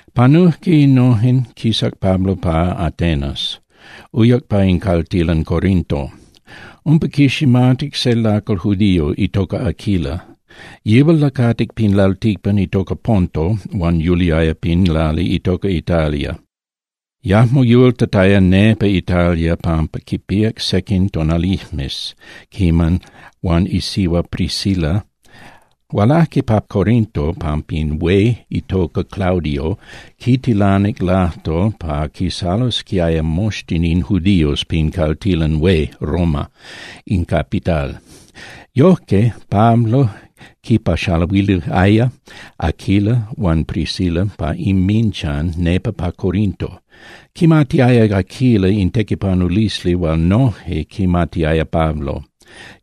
Panujque innojen, quisac Pablo pa Atenas, uyac pa in caltilan Corinto. Umpa quiximatic se lacal judío itoca Aquila. Yihual lacatic pin lalticpan itoca Ponto huan yuliaya pin lali itoca Italia. Yajmo yultataya nepa Italia pampa quipíac sequin tonalijmes quiman huan isihua Priscila hualajque pa Corinto. Hualajque pa Corinto pampa in hué itoca Claudio quitilanic lajtol pa quisalosquiaya moxtin in judíos pin caltilan hué Roma, in capital. Yojque Pablo quinpaxaluiliaya Aquila huan Priscila pa inminchan nepa pa Corinto. Quimatiaya Aquila in tequipanulisli hual noje quimatiaya Pablo,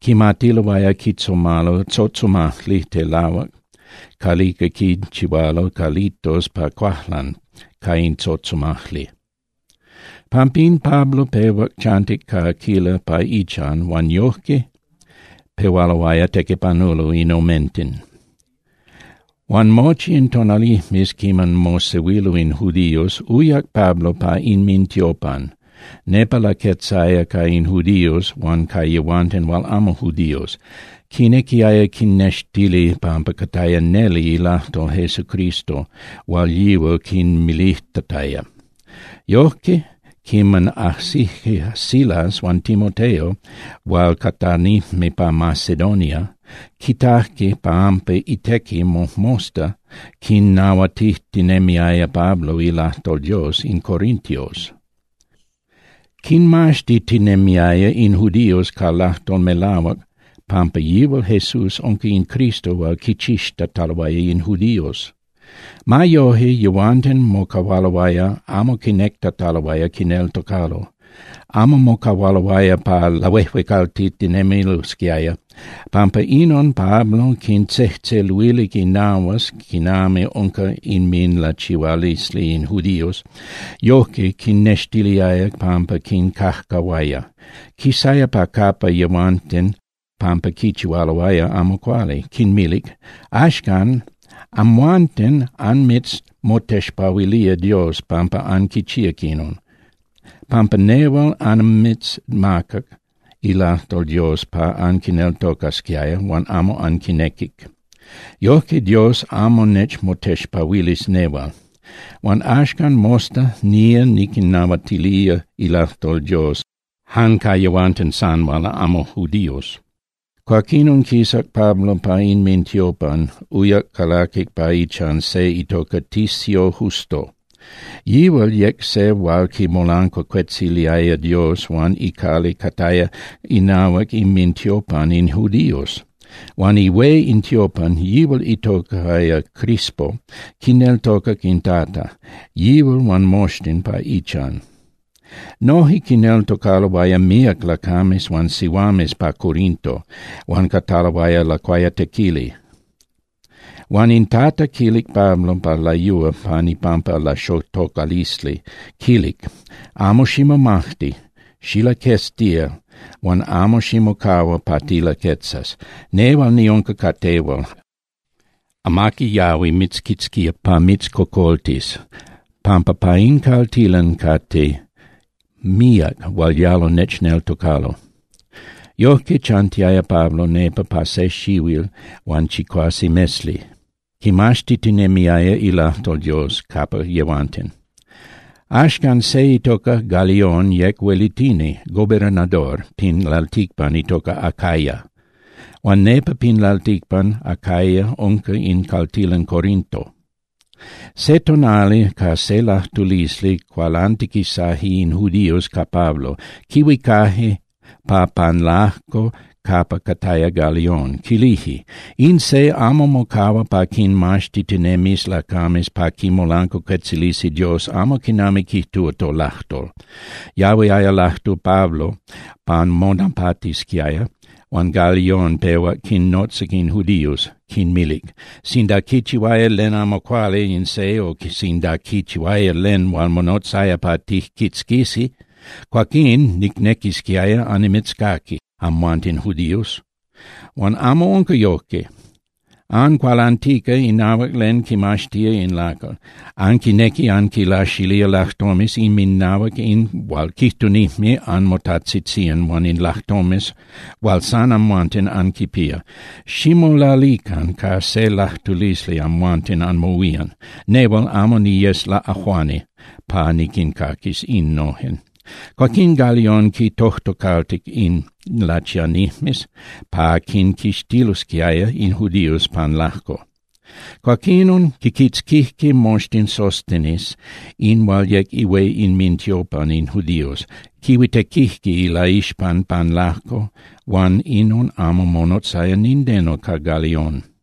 quimatiloaya quitzomalo tzotzomajli telahuac calica quinchihualo calitos pa cuajlan ca in tzotzomajli. Pampín Pablo pehuac chantic ca Aquila pa ichan huan yojque pehualoaya tequipanulo in omenten. Huan mochi in tonalijmes quiman mosehuilo in judíos, uyac Pablo pa inmintiopan. Nepa laquetzaya ca in judíos huan ca yehuanten hual amo judíos, quinequiaya quinnextili pampa cataya neli ilajtol Jesucristo hual yihual quinmilijtataya. Yojque, quiman ajsijque Silas huan Timoteo hual catanijme pa Macedonia, quitajque pampa itequi mojmosta quinnahuatijtinemiaya Pablo ilajtol Dios in corintios. Quinmaxtitinemiaya in judíos ca lajtol melahuac pampa yihual Jesús unca in Cristo hual quichixtataloaya in judíos. Ma yoje, yehuanten mocahualoaya amo quinectataloaya quineltocalo, amo mocahualoaya pa lahuejuecaltitinemilosquiaya. Pampa inon Pablo quintzejtzeluilic inahuas quinami unca inminlachihualisli in judíos, yojque quinnextiliaya pampa quincajcahuaya. Quisaya pa capa yehuanten pampa quichihualoaya amo cuali, quinmilic: —Axcan, amhuanten anmitzmotexpahuilía Dios pampa anquichíac inon, pampa nehual annimitzmacac ilajtol Dios pa anquineltocasquiaya, huan amo anquinequic. Yojque Dios amo nechmotexpahuilis nehual. Huan axcan mosta nía niquinnahuatilía ilajtol Dios jan ca yehuanten san hual amo judíos. Cuaquinon quisac Pablo pa inmintiopan, uyac calaquic pa ichan se itoca Ticio Justo. Yihual yec se hual quimolancuacuetziliaya Dios huan icali cataya inahuac inmintiopan in judíos. Huan ihué in tiopan, yihual itocaya Crispo, quineltocac in Tata, yihual huan moxtin pa ichan. Noje quineltocaloaya míac lacames huan sihuames pa Corinto huan cataloaya lacuayatequili. Huan in Tata quilic Pablo pa layúa pan ipampa laxotocalisli, quilic: —Amo ximomajti. Xilaqueztía huan amo ximocahua pa tilaquetzas. Nehual niunca ca tehual. Amaqui yahui mitzquitzquía pa mitzcocoltis pampa pa in caltilan cate míac hual yalo nechneltocalo. Yojque chantiaya Pablo nepa pa se xihuil huan chicuase mesli, quimaxtitinemiaya ilajtol Dios capa yehuanten. Axcan, se itoca Galión yec huelitini (gobernador) pin lalticpan itoca Acaya, huan nepa pin lalticpan Acaya unca in caltilan Corinto. Se tonali ca se lajtulisli cualantiquisaje in judíos ca Pablo, quihuicaje pa pan lajco capa cataya Galión. Quilije: —In se amo mocahua pa quinmaxtitinemis lacames pa quimolancuacuetzilisi Dios amo quinami quijtúa tolajtol. Yahuiaya lajtu Pablo pa monapatisquiaya huan Galión pehuac quinnotzac in judíos, quinmilic: —Sinda quichihuaya len amo cuali in se o sinda quichihuaya len hual monotzaya pa tijquitzquisi, cuaquín nicnequisquiaya annimitzcaqui amhuanten judíos. Huan amo unca yojque. Ancualantica inahuac len quimaxtía in lacal, anquinequi anquinlaxilía lajtomes inminahuac in hual quijtunijme anmotajtzitzían huan in lajtomes hual san amhuanten anquipía. Ximolalican ca se lajtulisli amhuanten anmohuían. Nehual amo niyes laꞌajuani pa niquincaquis innojen. Cuaquín Galión quintojtocaltic in lachianijmes pa quinquixtilosquiaya in judíos pan lajco. Cuaquinon quiquitzquijque moxtin Sóstenes in hual yec ihué inmintiopan in judíos, quihuitequijque ilaixpan pan lajco huan inon amo monotzaya nindeno ca Galión.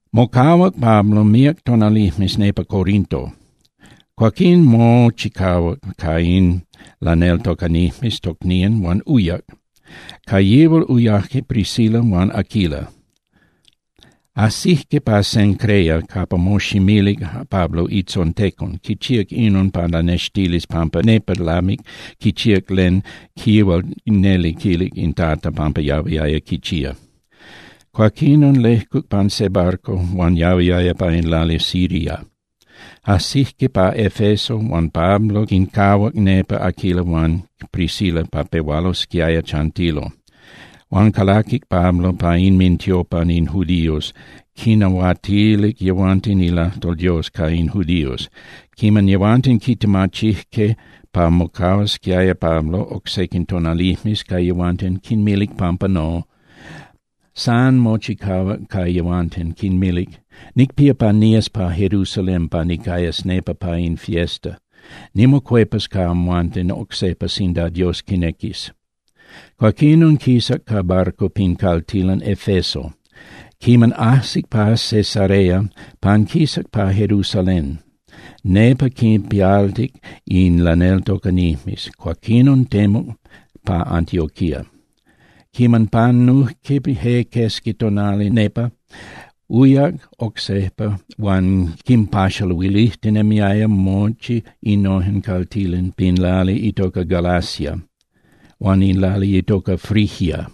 Mocahuac Pablo míac tonalijmes nepa Corinto. Cuaquín mochicahuac ca in laneltocanijmes tocnían huan uyac, ca yihual uyajque Priscila huan Aquila. Ajsijque pa Cencrea capa moximilic Pablo itzontecon. Quichíac inon pa lanextilis pampa nepa lamic quichíac len yihual neli quilic in Tata pampa yahuiaya quichía. Cuaquinon lejcuc pan se barco hual yahuiaya pa in lali Siria. Ajsijque pa Efeso huan Pablo quincahuac nepa Aquila huan Priscila pa pehualosquiaya chantilo. Huan calaquic Pablo pa inmintiopan in judíos, quinnahuatilic yehuanten ilajtol Dios ca in judíos. Quiman yehuanten quitemachijque pa mocahuasquiaya Pablo oc sequin tonalijmes ca yehuanten, quinmilic pampa no. San mochicahuac ca yehuanten, quinmilic: —Nicpía pa nías pa Jerusalén pa nicayas nepa pa in fiesta. Nimocuepas ca amhuanten oc sejpa sinda Dios quinequis. Cuaquinon quisac ca barco pin caltilan Efeso. Quiman ajsic pa Cesarea, panquisac pa Jerusalén, nepa quinpialtic in laneltocanijmes, cuaquinon temuc pa Antioquía. Quiman panujque je quesqui tonali nepa, uyac oc sejpa huan quinpaxaluilijtinemiaya mochi innojen caltilan pin lali itoca Galacia huan in lali itoca Frigia.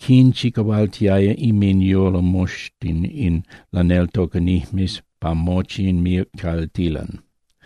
Quinchicahualtiaya inminyolo moxtin in laneltocanijmes pa mochi in míac caltilan.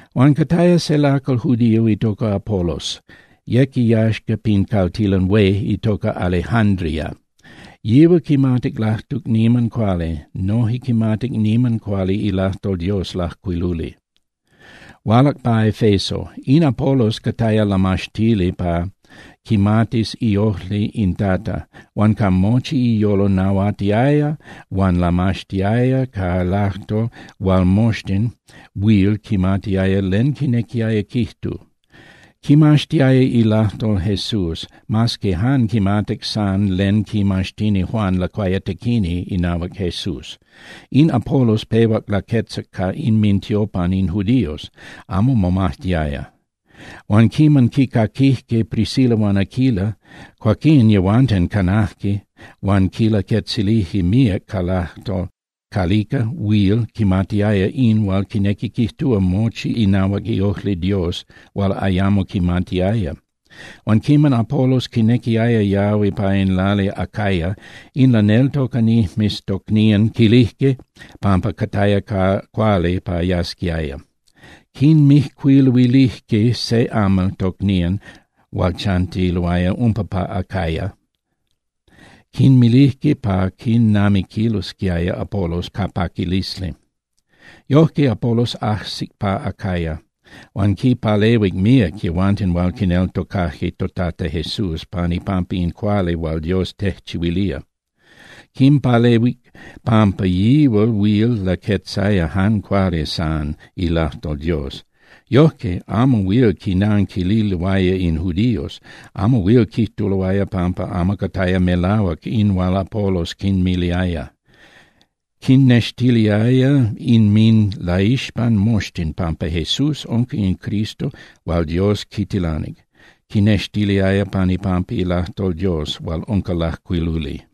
Huan cataya se lacal judío itoca Apolos, yec iyaxca pin caltilan hué itoca Alejándria. Yihual quimatic lajtuc niman cuali, noje quimatic niman cuali ilajtol Dios lajcuiluli. Hualac pa Efeso. In Apolos cataya lamaxtili pa quimatis iojli in Tata, huan ca mochi iyolo nahuatiaya huan lamaxtiaya ca lajtol hual moxtin huil quimatiaya len quinequiaya quijtu. Quimaxtiaya ilajtol Jesús, mas que jan quimatic san len quimaxtini Juan Lacuayatequini inahuac Jesús. In Apolos pehuac laquetzac pa inmintiopan in judíos, amo momajtiaya. Huan quiman quicaquijque Priscila huan Aquila, cuaquín yehuanten canajque huan quilaquetzilijque míac ca lajtol calica huil quimatiaya in hual quinequi quijtúa mochi inahuac iojli Dios hual ayamo quimatiaya. Huan quiman Apolos quinequiaya yahui pa in lali Acaya, in laneltocanijmes tocnían quilijque pampa cataya cuali pa yasquiaya. Quinmijcuiluilijque se amal tocnían hual chantiloaya umpa pa Acaya, quinmilijque pa quinamiquilosquiaya Apolos ca paquilisli. Yojque, Apolos ajsic pa Acaya, huan quinpalehuic míac yehuanten hual quineltocajque toTata Jesús pan ipampa in cuali hual Dios tejchihuilía. Quimpalehuic pampa yihual huil laquetzaya jan cuali san ilajtol Dios. Yojque amo huil quinanquililoaya in judíos, amo huil quijtuloaya pampa amo cataya melahuac in hual Apolos quinmiliaya. Quinnextiliaya inminlaixpan moxtin pampa Jesús unca in Cristo hual Dios quitilanic, quinnextiliaya pan ipampa ilajtol Dios hual unca lajcuiluli.